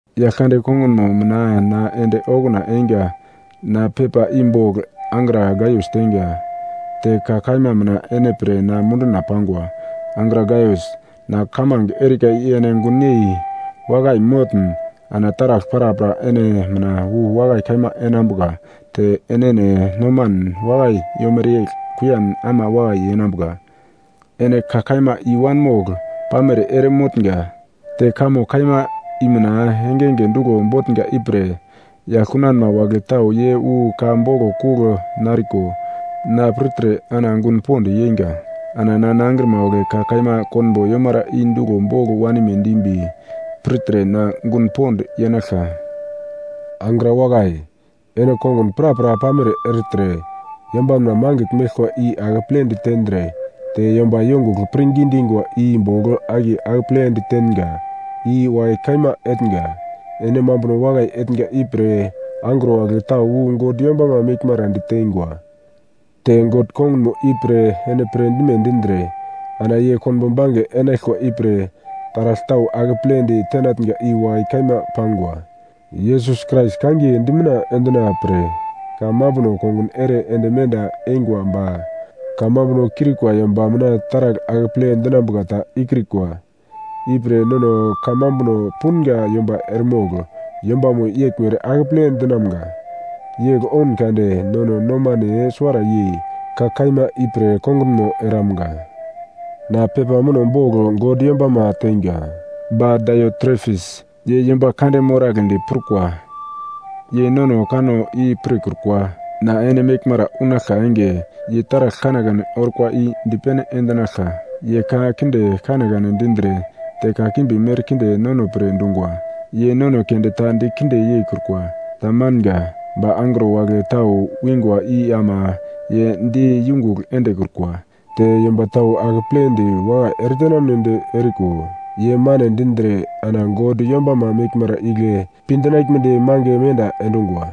Yaglkande kongunmo mina na ende okuna einga, na pepa i bogl angra Gaius teinga. Te ka kaima mina ene pre na munduna pangwa. Angra Gaius, na kamange erika i ene gunyei wakai motn ana taragl prapra ene mina wu wakai kaima enambuka te enene nomanen wakai yomere yegl kuiyan ama wakai yenambuka. Ene ka kaima i-wanmogl pamere ere motnga, te kamo kaima i mina engenge duglo botnga ipre yagl kunanma wagle tau ye wu ka boglo kugl nariko na pirtre ana gun pond yeinga. Ana na nangrima wagle ka kaima konbo yomara i duglo bogl wanime dimbi pirtre na gun pond yenaglka. Angra wakai, ene kongun prapra pamere ertre yombanma mangigl meglkwa i akepledi tendre te yomba yongugl pirngi dingwa i bogl akiye akeple ditenga i wakai kaima etnga. Ene mambuno wakai etnga ipre angro wagle tau wu God yombama meglmara ditengwa. Te God kongunmo ipre ene pirdime dindre ana ye konbo bange enaglkwa ipre taragl tau akeple ditenatnga i wakai kaima pangwa. Yesus Krais kangiye dimitna endina-pre kamambuno kongun ere ende menda eingwa ba kamambuno kiurikwa yomba mina taragl akeple dinambuka ta ikrikwa. Ipre nono kamambuno punga yomba eremogl yombamo yeglmere akeple dinamga. Yegl oun kade nono nomane suwara yei ka kaima ipre kongunmo eramga. Na pepa muno bogl God yombama teinga. Ba Daiotrefis, ye yomba kande moragledi prukwa. Ye nono kanno i pirkrukwa. Na ene meglmara unaglka enge, ye taragl kanekane orkwa i dipene endinaglka. Ye ka kinde kanekane dindre te kakimbi merkinde nono pre dungwa. Ye nono keunde ta dikinde yeikrukwa. Tamanga. Ba angro wagle tau wingwa i ama ye di yungugl endekrukwa, te yomba tau akepledi wakai eretenamnedi eriko ye mane dindre ana God yombama meglmara igle pi dinaglmedi mange menda endungwa.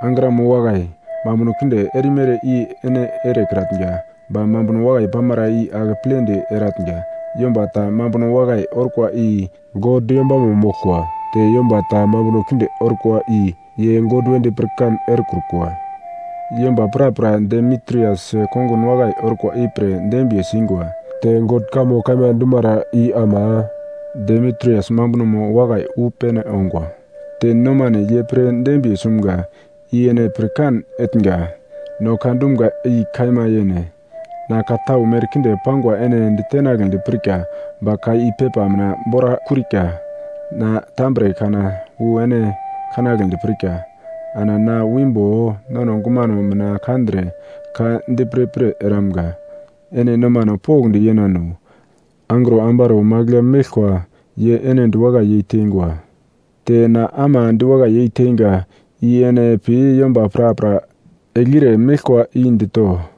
Angramo wakai, mambuno kinde erimere i ene erekratnga, ba mambuno wakai pamara i akepledi eratnga. Yomba ta mambuno wakai orkwa i God yombamo moglkwa, te yomba ta mambuno kinde orkwa i ye God wedi pirkan erekrukwa. Yomba prapra Demitrias kongun wakai orkwa ipre dembiye singwa. Te God kamo kaima dumara i ama Demitrias mambunomo wakai wu pene ongwa. Te nomane ye pre dembiye sumga, i ene pirkan etnga. No ka dumga i kaima yene. Na ka tau merkinde pangwa ene ditenagledi pirka, ba ka i pepa mina bora kiurika. Na tambre kana wu ene kanagledi pirka, ana na wimbo nono gumano mina kandre ka di pirpir eramga. Ene nomano pokndi yenano. Angro ambaro magl ya meglkwa ye ene diwakai yeitengwa, te na ama diwakai yeiteinga i ene pi yomba prapra eglire meglkwa i dito.